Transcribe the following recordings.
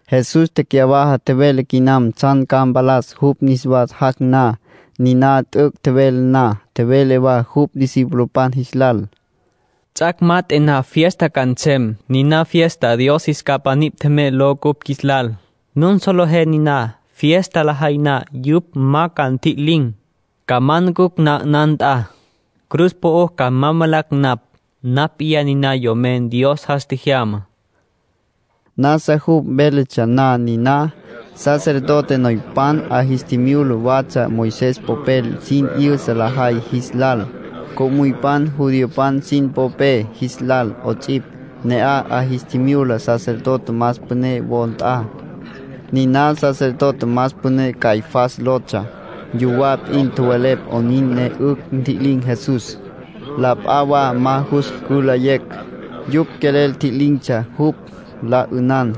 Jesús tecyawaja tjevele quinam tsjan ca mpalas jupj niswa jac' na. Niná t'üc' tjevele na, tjevele wa jupj discipulopan jis lal: “Ts'ac' mat'e na fiesta ca nsem, niná fiesta ‘Dios Qjuis Capa Nipj Tjemey’ ló cupj qjuis lal. Nun solejé niná. Fiesta lajay na, yupj ca ma tjililin̈, ca ma manucj ma 'ünan nt'a. Cruz po'o ca ma valacj napj. Napj p'iyá niná Yomen Dios jas tjejyamá”, nin tjevele Jesús. Nasa jupj véletsja na niná, sacerdote noypan 'a jis tjimyula watsja Moisés popel sin 'yüsa lajay jis lal, co'müypan judiopan sin popé jis lal 'ots'ipj. Ne'aj 'a jis tjimyula sacerdote más püné wo nt'a. Niná sacerdote más püné Caifás lotsja. Yuwá p'in tjowelepj 'onin ne 'ücj ntji'lin̈ Jesús, la p'a wa ma jus cülayecj. Yupj quelel tji'lin̈tsja jupj, la 'ünan.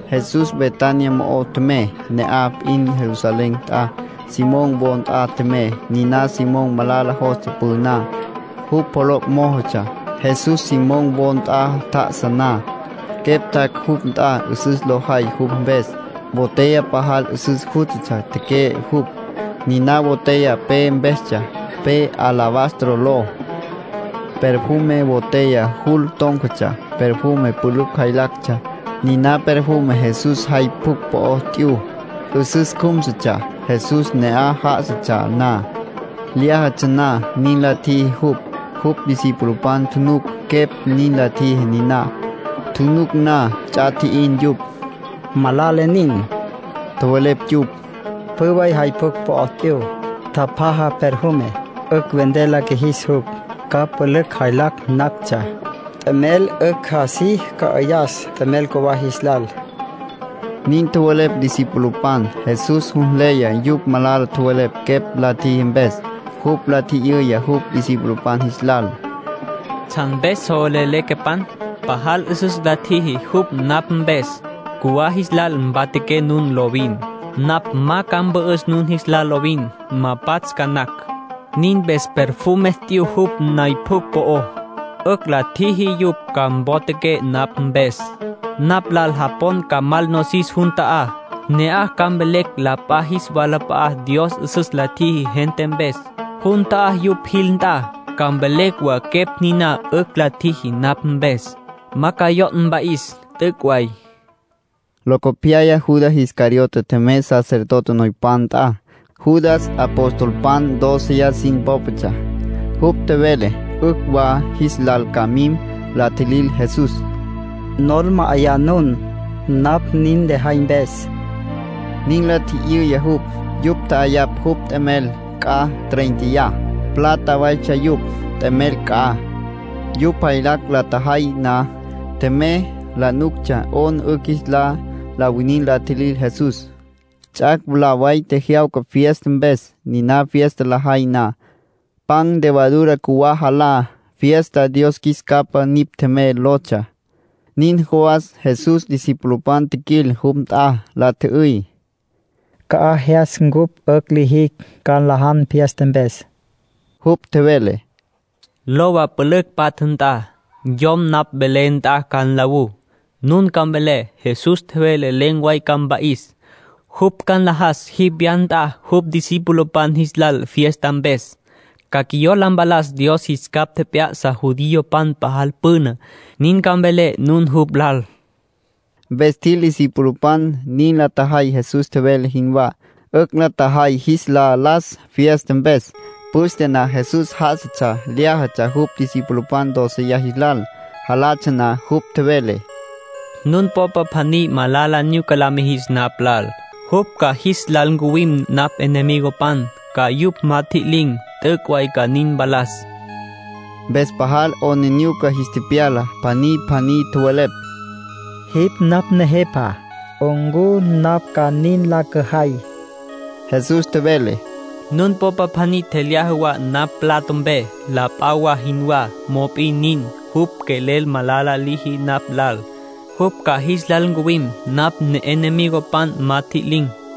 Jesús Betania mo'o tjemey, ne'aj p'in Jerusalén nt'a. Simón wo nt'a tjemey. Niná Simón malala jostsja püná. Jupj poloc' mójotsja. Jesús Simón wo nt'a tjá'asa na, quepj tjac' jupj nt'a 'üsüs lo jay jupj mpes. Botella pajal 'üsüs jústatsja teque'e jupj. Niná botella pe mpestsja, pe alabastro ló. Perfume botella jul tón̈catsja, perfume pülücj jaylactsja. Niná perfume Jesús jay pjucj po'ó t'yu. 'Üsüs cjúmsutsja. Jesús ne'aj já'asatsja na, lyájatsja na, nin la tjiji jupj. Jupj discipulopan tjunuc quepj nin la tjiji niná. Tjunuc na, ts'a tji'in yupj. —Malala nin —tjowelepj yupj—. Pjü way jay pjucj po'ó t'yu. Tjapjaja perfume. 'Ücj vender la qjuijis jupj. Ca pülücj jaylacj nactsja. T'emel 'ücj así cü'ayas t'emel cjuwá jis lal —nin tjowelepj discipulopan. Jesús jus nleya yupj malala tjowelepj quepj la tjiji mpes. Jupj la tji'yüya jupj discipulopan jis lal: —¿Tsjan mpes so velelé quepan? Pajal 'üsüs la tjiji jupj napj mpes. Cjuwá jis lal mpatjaqué nun lovin. Napj ma ca mpü'üs nun jis lal lovin. Ma pats' ca napj. Nin mpes perfume t'yu jupj nay pjucj po'ó. 'Ücj la ntjiji yupj ca ntoquecj napj mpes. Napj lal japon ca mal nosis jun ta'á. Ne'aj ca mvelecj la p'a jis walap'a'á Dios 'üsüs la tjiji gente mpes. Jun ta'á yupj jil nt'a, ca mvelecj wa quepj niná 'ücj la tjiji napj mpes. Ma ca yo' mpa'is. T'üc' way —nin tjevele Jesús. Locopyaya Judas Iscariote tjemey sacerdote noypan nt'a. Judas apostolpan dóceya sin pópatsja. Jupj tjevele 'ücj wa jis lal ca mim la tjilil Jesús. —¿Nol ma'ayá nun, napj nin lejay mpes? —nin la tji'yüya jupj. Yupj tja'ayapj jupj t'emel c'a tréinteya, plata waytsja yupj, t'emel c'a. Yupj jaylacj la tjajay na, tjemey. La nuctsja 'ona 'ücj jis lal la winin la tjilil Jesús. Ts'ac' mwalá way tjejyawca fiesta mpes. Niná fiesta lajay na, pan levadura cjuwá jalá. Fiesta “Dios Qjuis Capa Nipj Tjemey” lotsja. Nin jawas Jesús discipulopan tjiquil jupj nt'a. La tjü'üy: —¿Ca'aj jyas cupj 'ücj lijicj ca nlajan fiesta mpes? Jupj tjevele: —Lowa pülücj patja nt'a. Yom napj velé nt'a ca nlawú. Nun ca mvelé: ‘Jesús tjevele len̈ way ca mpa'is. Jupj ca nlajas jipj wya nt'a jupj discipulopan jis lal fiesta mpes. Ca quiyola mpalas Dios jis capj tjep'ya'sa judiopan pajal püna.’ Nin ca mvelé nun jupj lal. Mpes tjil discipulopan. Nin la tjajay Jesús tjevele jinwá. 'Ücj la tjajay jis la las fiesta mpes. Püste na Jesús já'asatsja, lyájatsja jupj discipulopan dóceya jis lal. Jalatsja na, jupj tjevele: —Nun popa pjaní malala nyuca la mijis napj lal. Jupj ca jis lal ncuwim napj enemigopan, ca yupj ma tjililin̈. T'üc' way ca nin mpalas —tjevele. Mpes pajal 'aplijila jis tepyala. Pjaní pjaní tjowelepj: —Jipj napj Nejepa. ¿Ncu napj ca nin la cüjay? Jesús tjevele: —Nun popa pjaní tjelyaja wa napj mplato mpe, la p'a wa jinwá, mop'in nin, jupj quelel malala liji napj lal. Jupj ca jis lal ncuwim napj enemigopan ma tjililin̈.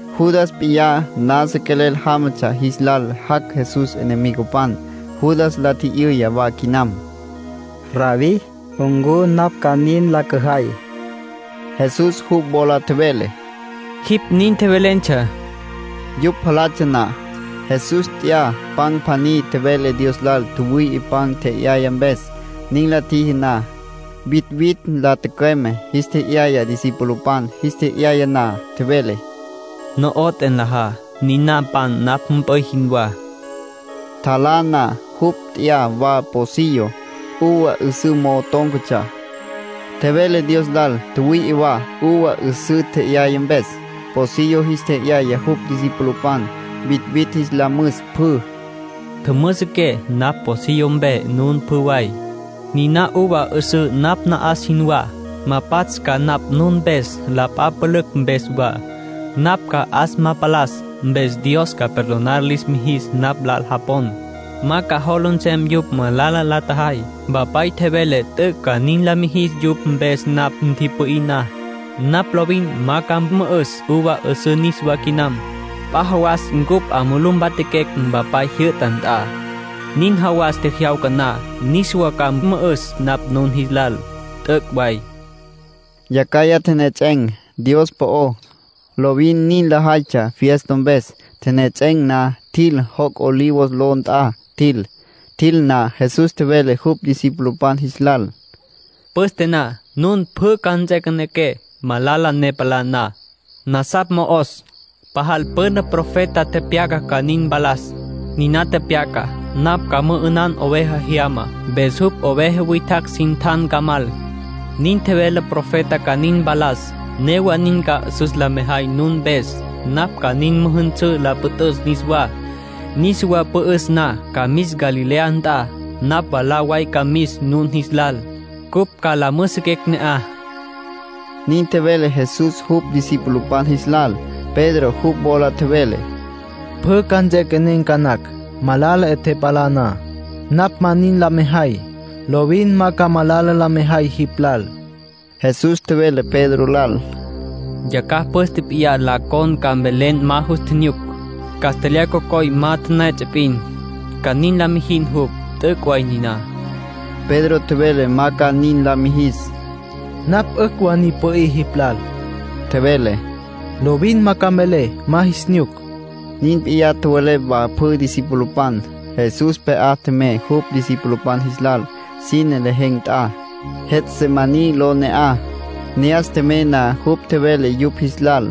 Judas p'iyá nasa quelel jámatsja jis lal jac' Jesús enemigopan. Judas la tji'yüya wa quinam: —Rabbí, ¿ncu napj ca nin la cüjay? Jesús jupj wola tjevele: —Nin. Yupj jalatsja na, Jesús nt'ya pan pjaní. Tjevele Dios lal tjüwüi'i pan tje'yaya mpes. Nin la tjiji na, vitvitj la tücüeme, jis tje'yaya discipulopan. Jis tje'yaya na, tjevele: —No'oté, nlajá. Niná pan napj mp'üy jinwá. Tjalá na, jupj nt'ya wa pocillo, uva 'üsǘ mo'o tón̈catsja. Tjevele Dios lal tjüwüi'i wa uva 'üsǘ tje'yaya mpes. Pocillo jis tje'yaya jupj discipulopan, vitvitj jis la müs pjü. —Tjümüsiqué napj pocillo mpe nun pjü way —tjevele jupj—. Niná uva 'üsǘ napj na'as jinwá. Ma pats' ca napj nun mpes, la p'a pülücj mpes wa. Napj ca 'as ma palas, mpes Dios ca perdonar lis mijis napj lal japon. Ma ca jola nsem yupj malala la tjajay. Mpapay tjevele t'üc' ca nin la mijis yupj mpes napj ntipü'í na. Napj lovin ma ca mü'üs uva 'üsǘ niswá quinam. P'a jawas cupj 'a mulú mpatjaquecj Mpapay jyü'ta nt'a. Nin jawas tjejyawca na, niswa ca mü'üs napj nun jis lal. T'üc' way —nin tjevele Jesús. Yacjaya tjenejets'en̈ Dios po'ó. Lovin nin lajaytsja fiesta mpes. Tjenejets'en̈ na, tjil. Joc' Olivos ló nt'a tjil. Tjil na, Jesús tjevele jupj discipulopan jis lal: —Püste na, nun pjü ca nts'equenequé, malala ne palá na. Nasapj mo'os. Pajal püna profeta tepyaca ca nin mpalas. Niná tepyacá: ‘Napj ca mü'ünan oveja jyama, mpes jupj oveja witjacj sin tjan ca mal’. Nin tjevele profeta ca nin mpalas. Newa nin ca 'üsüs la mejay nun mpes. Napj ca nin müjünsǘ la püt'üs niswá. Niswa pü'üs na, ca mis Galilea nt'a. Napj mwalá way ca mis nun jis lal, cupj ca la müjüsüquecj ne'aj —nin tjevele Jesús jupj discipulopan jis lal. Pedro jupj wola tjevele: —Pjü ca nts'equenen̈ ca nacj, malala 'e palá na. Napj ma nin la mejay. Lovin ma ca malala la mejay jipj lal. Jesús tjevele Pedro lal: —Yacjaj püste p'iyá la con ca mvelen ma nus nyuc. Castlyaj cocoy ma la tipiya p'in, ca nin la mijin jipj. T'üc' way niná —tjevele Jesús. Pedro tjevele ma ca nin la mijis. —Napj 'ücj wa ni pü'í jipj lal —tjevele—. Lovin ma ca mvelé ma jis nyuc. Nin p'iyá tjowelepj wa pjü discipulopan. Jesús pje'á tjemey jupj discipulopan jis lal sine lejen̈ nt'a. Getsemaní ló ne'aj. Ne'as tjemey na jupj tjevele yupj jis lal: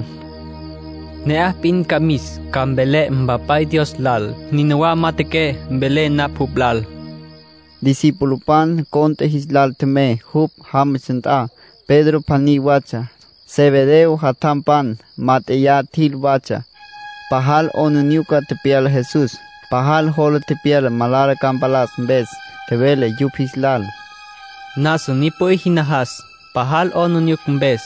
“Ne'aj p'in ca mis, ca mvelé Mpapay Dios lal. Nínawa majatjaqué velé na jupj lal”, tjevele. Discipulopan cont'e jis lal tjemey jupj jámatsja nt'a. Pedro pjaní watsja. Zebedeo jatjampan mát'eya tjil watsja. Pajal 'aplijila tepyala Jesús. Pajal jola tepyala malala ca mpalas mpes. Tjevele yupj jis lal: “Nasa ni pü'í jin najas, pajal 'aplijila mpes.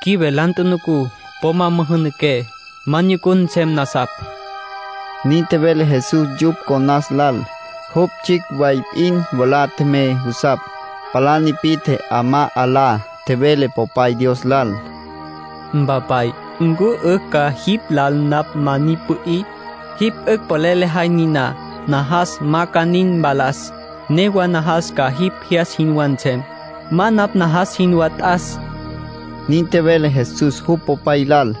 Qjuive la tjunucú. Po ma müjünaqué, ma nyucun nsem nasapj”, nin tjevele Jesús yupj conas lal. Jupj tsjicj way p'in mwalá tjemey jusapj. Palá nipi'tje 'amá 'alá. Tjevele Popay Dios lal: “Mpapay, ¿ncu 'ücj wa jipj lal napj ma ni pü'í? Jipj 'ücj polel lejay niná, najas ma ca nin ma palas. Newa najas ca jipj jyas jinwá nsem. Ma napj najas jinwá t'as”, nin tjevele Jesús jupj Popay lal.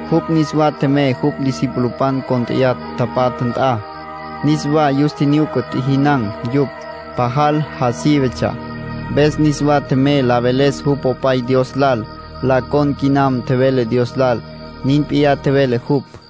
Jupj niswa tjemey jupj discipulopan cónt'eya tapatja nt'a. Niswa yus tjinyuca tjijinan̈ yupj. Pajal ja sívetsja. Mpes niswa tjemey la veles jupj Popay Dios lal. La con quinam tjevele Dios lal. Nin p'iyá tjevele jupj.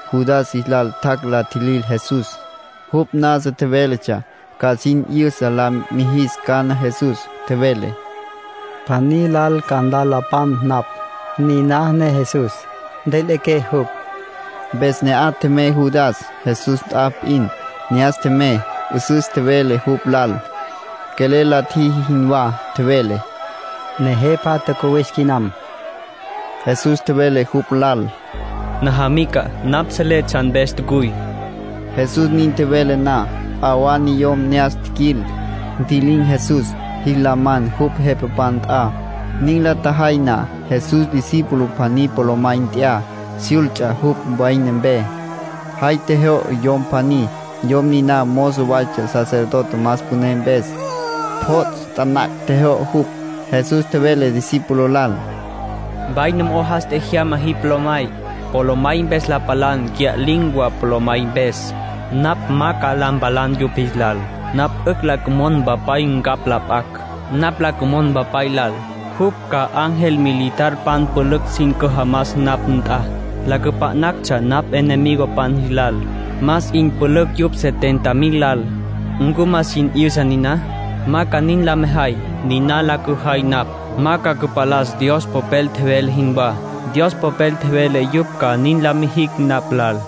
Judas jis lal tjac' la tjilil Jesús. Jupj nasa tjevéletsja ca sin 'yüsa la mijis cana Jesús. Tjevele: “Pjaní lal ca la nlapan napj. Niná ne Jesús. Ntjüiliqué jupj.” Mpes ne'aj tjemey Judas, Jesús nt'a p'in. Ne'as tjemey, 'üsüs tjevele jupj lal, quelel la tjiji jinwá. Tjevele: —Nejepa, tjacuwis quinam. Jesús tjevele jupj lal: —Najamica, napj selé tsjan mpes tjacuy. Jesús nin tjevele na, p'a wa niyom ne'as tjiquil. Ntji'lin̈ Jesús, jis la man jupj jepapan nt'a. Nin la tjajay na, Jesús discípulo pjaní polomay nt'ya, syults'a jupj vaina mpe. Jay tjejyo'o yom pjaní. Yom niná mozo waytsja, sacerdote más püné mpes. Pjots' taná tjejyo'o jupj. Jesús tjevele discípulo lal: —Vaina mo'o jas tjejyama jipj polomay. Polomay mpes la palan, cya'lin̈ wa polomay mpes. Napj ma ca la mpalan yupj jis lal. Napj 'ücj la cümon Mpapay ncapj la p'acj. Napj la cümon Mpapay lal, jupj ca ángel militarpan pülücj sin cüjamas napj nt'a, la cüpa'nactsja napj enemigopan jis lal. Más 'in pülücj yupj setenta mil lal. ¿Ncu ma jin 'yüsa niná? Ma ca nin la mejay. Niná la cüjay napj, ma ca cüpalas Dios Popel tjevele jinwá. Dios Popel tjevele yupj ca nin la mijicj napj lal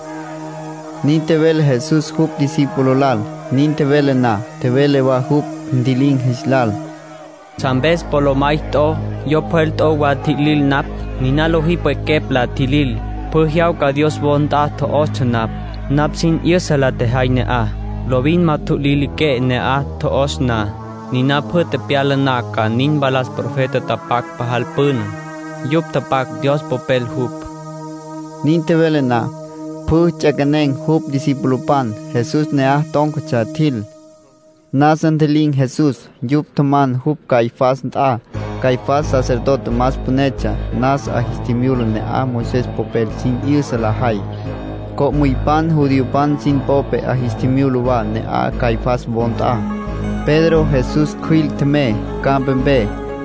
—nin tjevele Jesús jupj discípulo lal. Nin tjevele na, tjevele wa jupj ntji'lin̈ jis lal: —¿Tsjan mpes polomay t'o, yo pjwel t'o wa la tjilil napj? Niná lojí pwequepj la tjilil. Pjü jyawca Dios wo nt'a tjo'ostsja napj. Napj sin 'yüsa la tjejay ne'aj. Lovin ma ntjutjililiqué ne'aj tjo'os na. Niná pjü tepyala ca nin mpalas profetapan tapac pajal püna. Yupj tapac, Dios Popel jupj —tjevele Jesús. Nin tjevele na, pjü ts'equenen̈ jupj discipulopan. Jesús ne'aj tón̈catsja tjil. Nasa ntji'lin̈ Jesús. Yupj tjaman jupj Caifás nt'a. Caifás sacerdote más pünetsja. Nasa 'a jis tjimyula ne'aj Moisés popel sin 'yüsa lajay. Co'müypan judiopan sin popé 'a jis tjimyula wa ne'aj, Caifás wo nt'a. Pedro Jesús cjüil tjemey campapé.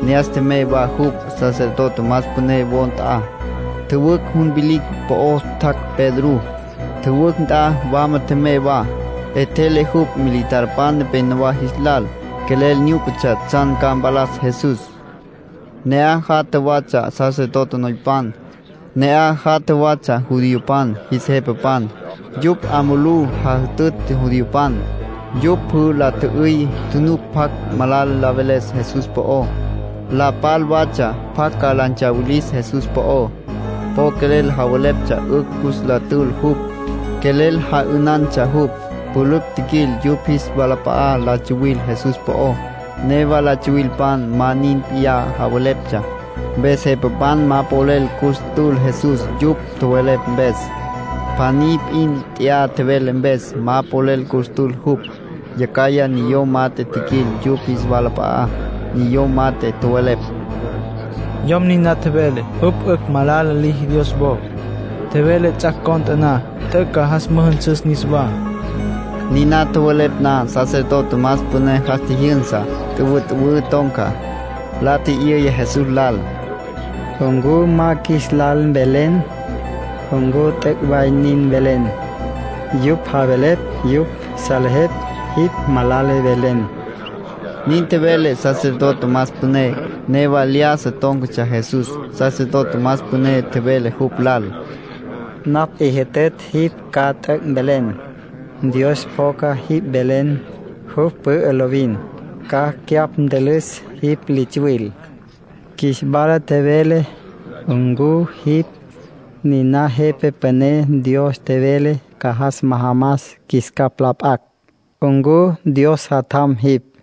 Ne'as tjemey wa jupj sacerdote más püné wo nt'a. Tjüwücj jun vilicj po'ó tjac' Pedrú. Tjüwücj nt'a wama tjemey wa. 'Etjele jupj militarpan nepénowa jis lal. Quelel nyúcatsja tsjan ca mpalas Jesús. Ne'aj jatja watsja sacerdote noypan. Ne'aj jatja watsja judiopan jis jepapan. Yupj 'a mulú jajütütj judiopan. Yupj pjü la tjü'üy tjunuc pjacj malala mveles Jesús po'ó. La tapal watsja pjacj ca la ntsawilis Jesús po'ó. Po quelel javeleptsja 'ücj cus la tül jupj. Quelel ja'ünantsja jupj. Pülücj tjiquil yupj jis walap'a'á la tsuwil Jesús po'ó. Newa la tsuwilpan ma nin p'iyá javeleptsja. Mpes jepapan ma polel cus tül Jesús yupj tjowelepj mpes. Pjaní p'in t'ya tjevele mpes, ma polel cus tül jupj. Yacjaya niyom mat'e tjiquil yupj jis walap'a'á. Niyom mat'e tjowelepj: —Yom niná tjevele jupj 'ücj malala liji Dios wo. Tjevele ts'ac' cont'e na t'üc' ca jas müjünsüs niswá. Niná tjowelepj na, sacerdote más püné jas tjijyünsa, tüwütüwǘ ton̈ca. La tji'yüya Jesús lal: —¿Ncu ma ca qjuis lal mvelen ncu t'üc' way nin tjevelen? Yupj javelepj yupj salejepj jipj malala tjevelen —nin tjevele sacerdote más püné. Newa lyájasa tón̈catsja Jesús. Sacerdote más püné tjevele jupj lal: —Napj 'i jütütj jipj ca t'üc' mvelen. Dios pjoca jipj velen. Jupj pü'ü lovin. Ca cyapj ntülüs jipj li tsuwil. Qjuis wala tjevele ncu jipj niná Jepa Püné Dios tjevele ca jas majamas qjuis capj la p'acj. ¿Ncu Dios Jatjam jipj?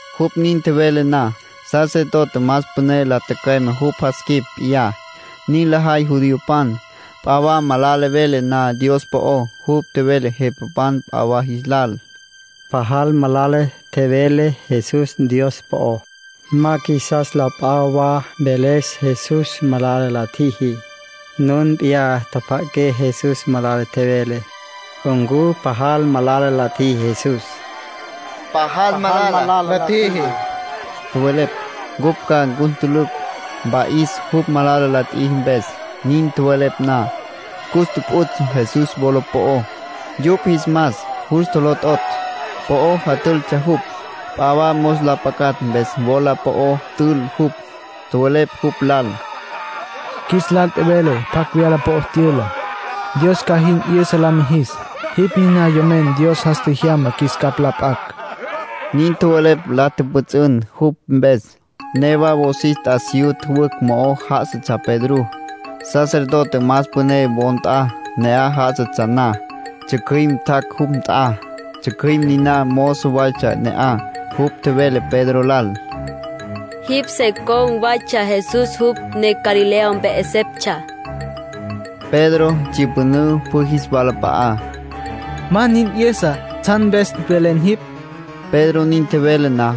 Jupj nin tjevele na, sacerdote más püné la tücüeme jupj jas quip p'iyá. Nin lajay judiopan, p'a wa malala vele na Dios po'ó. Jupj tjevele jepapan p'a wa jis lal: —Pajal malala tjevele Jesús Dios po'ó. Ma qjuisas la p'a wa mveles Jesús malala la tjiji. Nun p'iyá tjapja'aqué Jesús malala tjevele. ¿Ncu pajal malala la tjiji Jesús? —Pajal malala la tjiji —tjowelepj—. Cupj ca cus ntülücj, mpa'is, jupj malala la tjiji mpes. Nin tjowelepj na, cus tjupjuts' Jesús, wola po'ó. Yupj jis mas jus tjolototj, po'o jatültsja jupj. P'a wa mos la pacatj mpes wola po'ó tül jupj. Tjowelepj jupj lal: —Qjuis lal tjevele pjacj wyala po'ó tyüla. Dios ca jin 'yüsa la mijis. Jipj niná Yomen Dios jas tjejyama qjuis capj la p'acj —nin tjowelepj la tjüpjüts'ün jupj mpes. Newa wosis t'asiyú tjüwücj mo'o já'asatsja Pedrú, sacerdote más püné wo nt'a. Ne'aj já'asatsja na, tsjücjüim tjac' jupj nt'a. Tsjücjüim niná mozo waytsja ne'aj. Jupj tjevele Pedro lal: —Jipj se con̈ watsja Jesús, jupj ne Galilea mpe 'eseptsja. Pedro tsyüpünǘ pjü jis walap'a'á. —Ma nin 'yüsa tsjan mpes velen jipj —tjevele. Pedro nin tjevele na,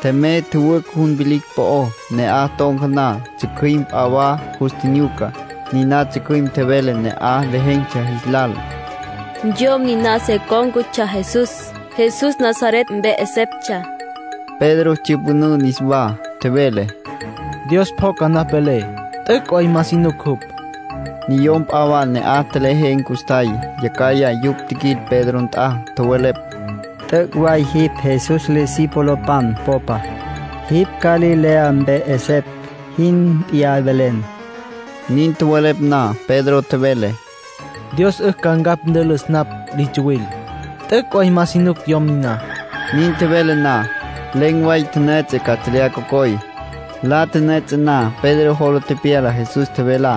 tjemey tjüwücj jun vilicj po'ó. Ne'aj ton̈ca na, tsjücjüim p'a wa jus tjinyuca. Niná tsjücjüim tjevele ne'aj lejen̈tsja jis lal: —Yom niná se cón̈catsja Jesús, Jesús Nazaret mpe 'eseptsja. Pedro tsyüpünǘ niswá. Tjevele: —Dios pjoca napj velé. T'üc' way ma si nuc jupj —tjevele. Niyom p'a wa ne'aj tjelejen̈ custjay. Yacjaya yupj tjiquil Pedro nt'a. Tjowelepj: —T'üc' way jipj Jesús discipulopan popa. Jipj Galilea mpe 'esepj jin p'iyá velen. Nin tjowelepj na, Pedro tjevele: —Dios 'ücj ca ncapj ntülüs napj li tsuwil. T'üc' way ma si nuc yom niná. Nin tjevele na, len̈ way la tipiya castlyaj cocoy. La tipiya na, Pedro jola tepyala Jesús tjevelá.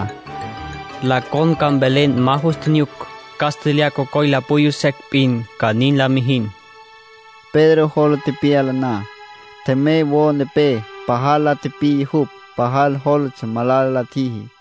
“La con ca mvelen ma nus nyuc. Castlyaj cocoy la puyú secj p'in, ca nin la mijin”, tjevele Jesús. Pedro jola tepyala na, tjemey wo nepé. Pajal la tipiya jupj. Pajal jólatsja malala la tjiji.